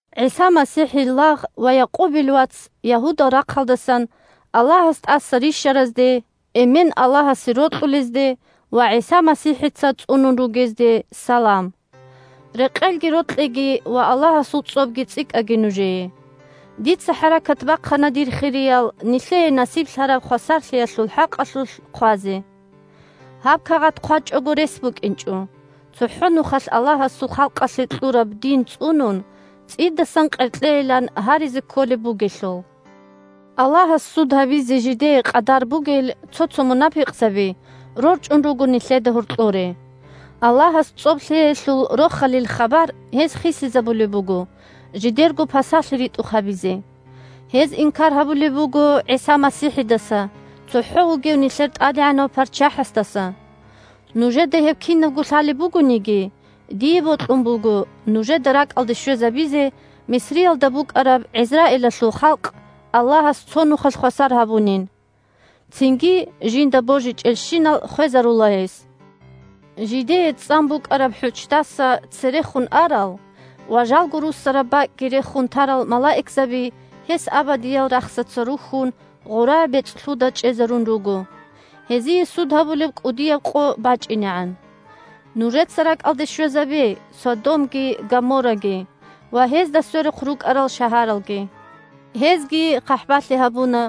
ГӀиса МасихӀил лагъ ва Якъубил вац Ягьудал рахъалдасан Аллагьас тӀаса рищаразде, Эмен – Аллагьасе рокьулезде ва ГӀиса МасихӀица цӀунун ругезде салам. Рекъелги, рокьиги ва Аллагьасул цӀобги цӀикӀкӀаги нужее. Дица хӀаракат бахъана, дир хириял, нилъее насиблъараб хвасарлъиялъул хӀакъалъулъ хъвазе. Гьаб кагъат хъвачӀого рес букӀинчӀо, цохӀо нухалъ Аллагьасул халкъалъе кьураб дин цӀунун цӀидасан къеркьейилан гьаризе кколеб бугелъул. Аллагьас суд гьабизе жидее къадар бугел цо-цо мунапикъзаби рорчӀун руго нилъеда гьоркьоре. Аллагьас цӀоб лъеялъул Рохалил хабар гьез хисизабулеб буго, жидерго пасалъи ритӀухъ гьабизе. Гьез инкар гьабулеб буго ГӀиса МасихӀидаса – цохӀо вугев нилъер ТӀадегӀанав ПарччахӀасдаса. Нужеда гьеб кинабго лъалеб бугониги, дие бокьун буго нужеда ракӀалде щвезабизе Мисриялда букӀараб ГӀизраилалъул халкъ Аллагьас цо нухалъ хвасар гьабунин. Цинги жинда божичӀелщинал хвезарула гьес. Жидее цӀан букӀараб хӀуччдаса церехун арал ва жалго руссараб бакӀги рехун тарал малаикзаби гьес абадиял рахсаца рухьун гъора бецӀлъуда чӀезарун руго, гьезие суд гьабулеб кӀудияб къо бачӀинегӀан. Нужеца ракӀалде щвезабе Содомги Гоморраги ва гьезда сверухъ рукӀарал шагьаралги: гьезги хъахӀбалъи гьабуна,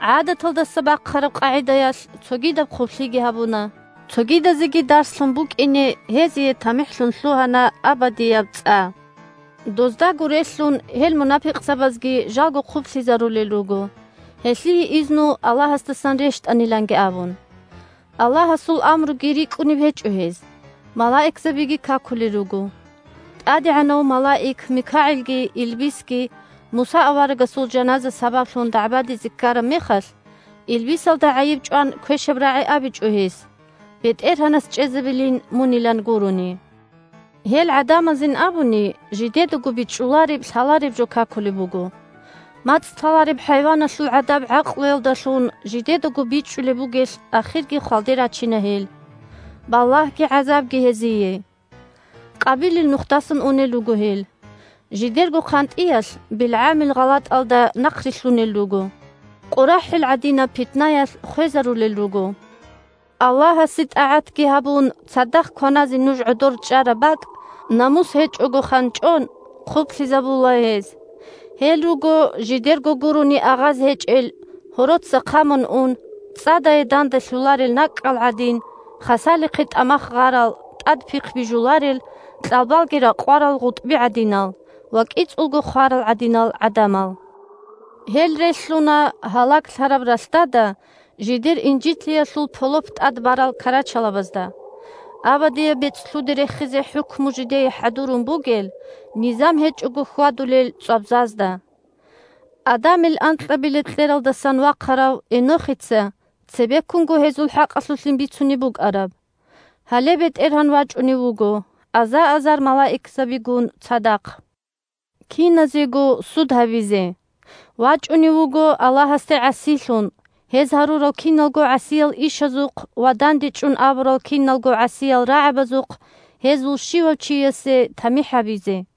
гӀадаталдаса бахъараб къагӀидаялъ цогидаб хъублъиги гьабуна. Цогидазеги дарслъун букӀине, гьезие тамихӀлъун лъугьана абадияб цӀа. Доздаго релълъун гьел мунапикъзабазги жалго хъублъизарулел руго, гьелъие изну Аллагьасдасан рещтӀаниланги абун. Аллагьасул амруги рикӀкӀунеб гьечӀо гьез, малаикзабиги какулел руго. ТӀадегӀанав малаик МикагӀилги илбисги Муса аварагасул жаназа сабаблъун дагӀбадизе ккараб мехалъ, илбисалда гӀайиб чӀван квешаб рагӀи абичӀо гьес, «БетӀергьанас чӀезабилин мунилан» гурони. Гьел гӀадамазин абуни жидедаго бичӀчӀулареб-лъалареб жо какулеб буго. МацӀ лъалареб хӀайваналъул гӀадаб гӀакълуялдалъун жидедаго бичӀчӀулеб бугелъ ахирги хвалде рачина гьел. Балагьги гӀазабги гьезие! Къабилил нухдасан унел руго гьел. Жидерго хъантӀиялъ БилгӀамил гъалатӀалда нахърилълъунел руго. КъорахӀил гӀадинаб питнаялъ хвезарулел руго. Аллагьасе тӀагӀатги гьабун цадахъ кваназе нуж гӀодор чӀараб бакӀ, намус гьечӀого ханчӀон, хъублъизабула гьез. Гьел руго жидерго гурони агъаз гьечӀел, гьороца хъамун ун, цӀадае данделъуларел накӀкӀал гӀадин, хасалихъе тӀамах гъарал, тӀад пихъги бижуларел, кьалбалги ракъварал гъутӀби гӀадинал ва кӀицӀулго хварал гӀадинал гӀадамал. Гьел релълъуна гьалаглъараб ралъдада жидер инжитлъиялъул полоп тӀад барал карачалабазда, абадияб бецӀлъуде рехизе хӀукму жидее хӀадурун бугел, низам гьечӀого хьвадулел цӀвабзазда. Адамил анкьабилеб кьералдасан вахъарав Энохица цебеккунго гьезул хӀакъалъулъин бицунеб букӀараб: «Гьале, БетӀергьан вачӀунев вуго аза-азар малаикзабигун цадахъ киназего суд гьабизе. ВачӀунев вуго Аллагьасде гӀасилъун гьез гьарурал киналго гӀасиял ишазухъ ва дандечӀун абурал киналго гӀасиял рагӀабазухъ гьезул щивав чиясе тамихӀ гьабизе».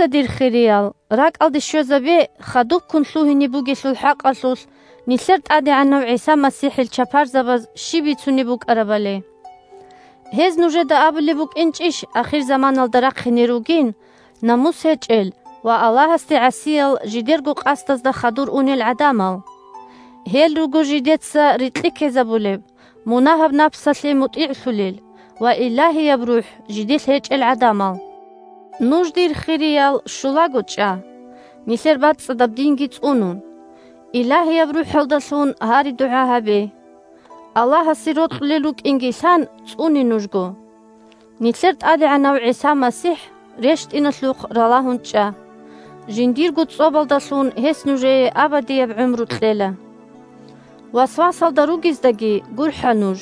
Нужеца, дир хириял, ракӀалде щвезабе хадубккун лъугьине бугелъул хӀакъалъулъ нилъер ТӀадегӀанав ГӀиса МасихӀил чапарзабаз щиб бицунеб букӀарабали. Гьез нужеда абулеб букӀинчӀищ ахирзаманалда рахъине ругин намус гьечӀел ва Аллагьасде гӀасиял жидерго къасдазда хадур унел гӀадамал? Гьел руго жидеца рикьи ккезабулел, мунагьаб напсалъе мутӀигӀлъулел ва Илагьияб РухӀ жиделъ гьечӀел гӀадамал. Нуж, дир хириял, щулаго чӀа, нилъер бацӀцӀадаб динги цӀунун. Илагьияб РухӀалдалъун гьари-дугӀа гьабе. Аллагьасе рокьулел рукӀинги лъан, цӀуне нужго. Нилъер ТӀадегӀанав ГӀиса МасихӀ рещтӀиналъухъ ралагьун чӀа, жиндирго цӀобалдалъун гьес нужее абадияб гӀумру кьела. Васвасалда ругездаги гурхӀа нуж.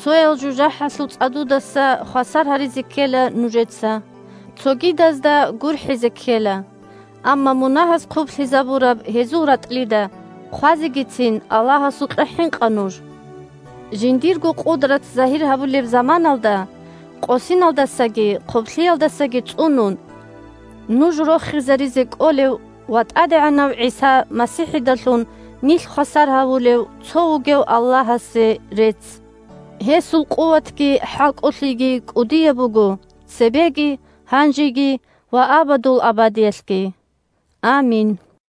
Цоял жужахӀалъул цӀадудаса хвасар гьаризе ккела нужеца. Цогидазда гурхӀизе ккела, амма мунагьаз хъублъизабураб гьезул ратӀлида хъвазегицин Аллагьасукьа хӀинкъа нуж! Жиндирго къудрат загьир гьабулеб заманалда къосиналдасаги хъублъиялдасаги цӀунун, нуж рохизаризе кӀолев ва ТӀадегӀанав ГӀиса МасихӀидалъун нилъ хвасар гьарулев Цо вугев Аллагьасе рецц! Гьесул къуватги хӀалкӀолъиги кӀудияб буго цебеги, гьанжеги ва абадул абадиялъги. Амин!